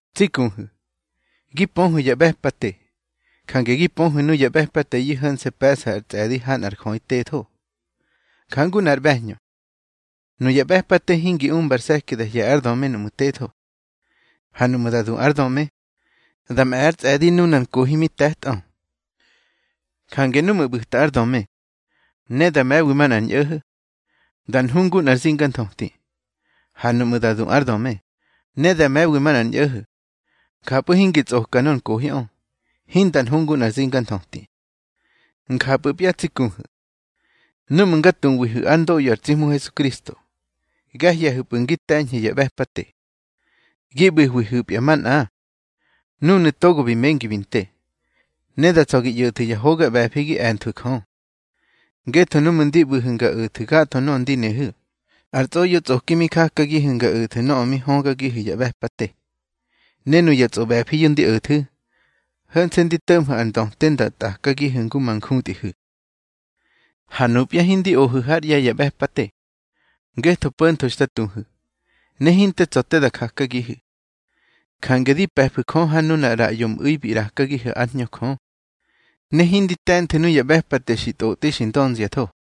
Tsi kuhu̱, gi pöhu̱ ya ꞌbe̱pate, jange gi pöhu̱ nuya ꞌbe̱pateyu̱ ho̱nse̱ pe̱ꞌsa ar tsꞌe̱di ha nꞌar jöꞌi tetho. Njangu nꞌar ꞌbe̱hñö, nuya ꞌbe̱pate hingi umba ar se̱ki da hye̱ ár döme núꞌmu̱ tetho. Ha nuꞌmu̱ da du ár döme, da mꞌe̱ ár tsꞌe̱di nunar nkohi mi te̱tꞌö. Jange nuꞌmu̱ ꞌbu̱ta ár döme, ne da me̱wi manꞌar ñꞌo̱ho̱, da nhu ngu nꞌar zinganthöti. Ha nuꞌmu̱ da du ár döme, ne da me̱wi manꞌar ñꞌo̱ho̱, njapꞌu̱ hingi tsꞌoka nor nkohiꞌö, hinda nhu ngu nꞌar zinganthöti. Njapꞌu̱pya tsi kuhu̱, núꞌmu̱ nga tuwihu̱ ár ndoꞌyo ar tsi Hmu Hesukristo, ga hye̱hu̱pꞌu̱ ngi te̱ñhu̱ ya ꞌbe̱pate. Gi ꞌbu̱hwihu̱pya manꞌa nunu̱ togo bi mengi bi nte, ne da tsa̱ gi ꞌyo̱thu̱ ya hoga ꞌbe̱fi gi e̱nthwu̱ Jö. Ngetho núꞌmu̱ ndi ꞌbu̱hu̱ nga o̱thu̱ gatho nöꞌö ndi nehu̱, ar tsꞌoꞌyotsꞌoki mi jakagihu̱ nga o̱thu̱ nöꞌö mi högagihu̱ ya ꞌbe̱pate. Ne nuya tsꞌoꞌbe̱fiyu̱ ndi o̱thu̱, ho̱nse̱ ndi to̱ꞌmhu̱ ar ndöte nda tꞌakagihu̱ ngu ma njutꞌihu̱. Ha nupya hindi ohu̱ hár ꞌye̱ ya ꞌbe̱pate, ngetho po̱ntho xta tuhu̱, ne hinte tsa̱ te da jakagihu̱. Jange di pe̱fu̱ Jö ha nunar ꞌraꞌyo mꞌu̱i bi ꞌrakagihu̱ ár Hñö Jö, ne hindi te̱nthu̱ nuya ꞌbe̱pate xi tꞌotꞌi xi ndönziatho.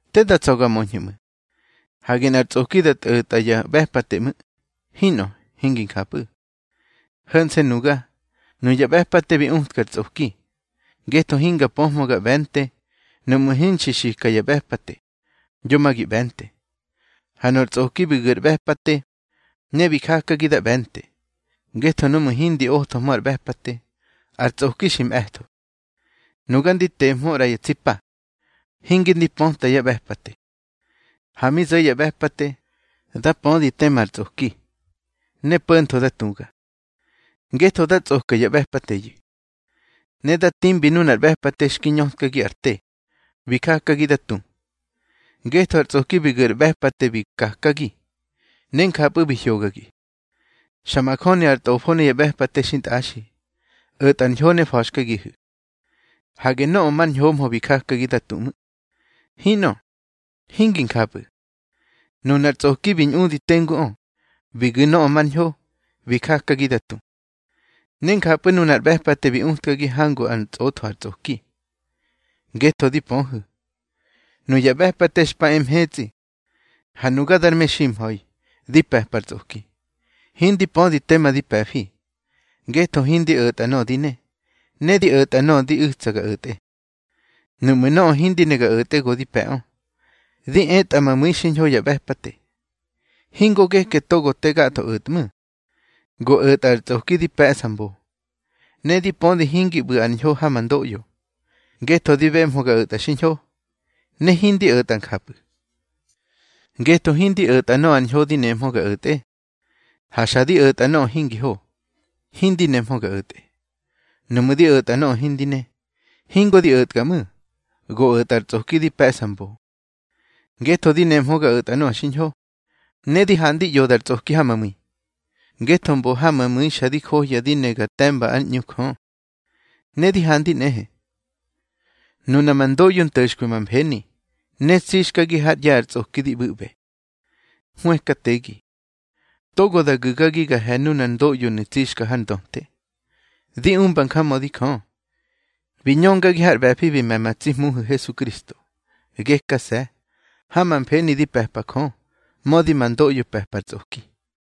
Te da tsa̱ ga möñhu̱ ꞌmu̱. Hage nꞌar tsꞌoki da tꞌo̱tꞌa ya ꞌbe̱pate ꞌmu̱. Hinꞌö, hingi njapꞌu̱. Ho̱nse̱ nuga, nuya ꞌbe̱pate bi utkar tsꞌoki. Ngetho hinga pöhmö ga ꞌbe̱nte nuꞌmu̱ hinxi xika ya ꞌbe̱pate: Yo ma gi ꞌbe̱nte. Ha nor tsꞌoki bi gu̱ ar ꞌbe̱pate ne bi jakagi da ꞌbe̱nte. Ngetho nuꞌmu̱ hindi othohmö ar ꞌbe̱pate, ar tsꞌoki xi mꞌe̱tho. Nuga ndi tehmö ꞌra ya tsi pa, hinge ndi pöta ya ꞌbe̱pate. Ha mi zo̱ ya ꞌbe̱pate, da pödi tema ar tsꞌoki. Ne po̱ntho da tuga, ngetho da tsꞌoka ya ꞌbe̱pateyu̱. Ne da timbi nunar ꞌbe̱pate xki ñötkagi ar te, bi jakagi da tu. Ngetho ar tsꞌoki bi gu̱ ar ꞌbe̱pate bi kakagi, ne njapꞌu̱ bi hyogagi. Xa majöni ar tꞌofo ne ya ꞌbe̱pate xintꞌaxi, o̱tꞌar ñho ne fa̱xkagihu̱. Hage nöꞌö mar ñhomhö bi jakagi da tu ꞌmu̱. Hinꞌö, hingi njapꞌu̱. Nunar tsꞌoki bi ñꞌudi tenguꞌö, bi gu̱ nöꞌö mar ñho, bi jakagi da tu. Ne njapꞌu̱ nunar ꞌbe̱pate bi utkagi hangu ár ntsꞌotho ar tsꞌoki. Ngetho di pöhu̱, nuya ꞌbe̱pate xpa e mhetsꞌi, ha nuga dar meximha̱i, di pe̱par tsꞌoki. Hindi pödi tema di pe̱fi. Ngetho hindi o̱tꞌa nöꞌö di ne, ne di o̱tꞌa nöꞌö di u̱tsa ga o̱tꞌe. Nuꞌmu̱ nöꞌö hindi ne ga o̱tꞌe, go di pe̱ꞌö, di etꞌa ma mu̱i xiñho ya ꞌbe̱pate. Hingo geke togo te gatho o̱tꞌmu̱, go o̱tꞌa ar tsꞌoki di pe̱ꞌsa mbo. Ne di pödi hingi ꞌbu̱ ar ñho ha ma ndoꞌyo, ngetho di bemhö ga o̱tꞌa xiñho, ne hindi o̱tꞌa njapꞌu̱. Ngetho hindi o̱tꞌa nöꞌö ar ñho di nemhö ga o̱tꞌe. Ha xa di o̱tꞌa nöꞌö hingi ho, hindi nemhö ga o̱tꞌe. Nuꞌmu̱ di o̱tꞌa nöꞌö hindi ne, hingo di o̱tga ꞌmu̱, go o̱tꞌa ar tsꞌoki di pe̱ꞌsa mbo. Ngetho di nemhö ga o̱tꞌa nöꞌö xiñho, ne di handi ꞌyoda ar tsꞌoki ha ma mu̱i. Ngetho mbo ha ma mu̱i xa di johya di ne ga te̱mba ár ꞌñu Jö. Ne di handi nꞌehe, nuna ma ndoꞌyo nto̱xkwi ma mfeni, ne tsixkagi hár ꞌye̱ ar tsꞌoki di ꞌbu̱ꞌbe. Hwëkategi. Togo da gu̱gagi ga he̱ nunar ndoꞌyonu̱ tsixka har ndöte. Di umba njamödi Jö, bi ñöngagi har ꞌbe̱fi bi me̱ ma tsi Hmuhu̱ Hesukristo. Gekase̱, ha ma mfeni di pe̱pa Jö, mödi ma ndoꞌyo pe̱pa ar tsꞌoki.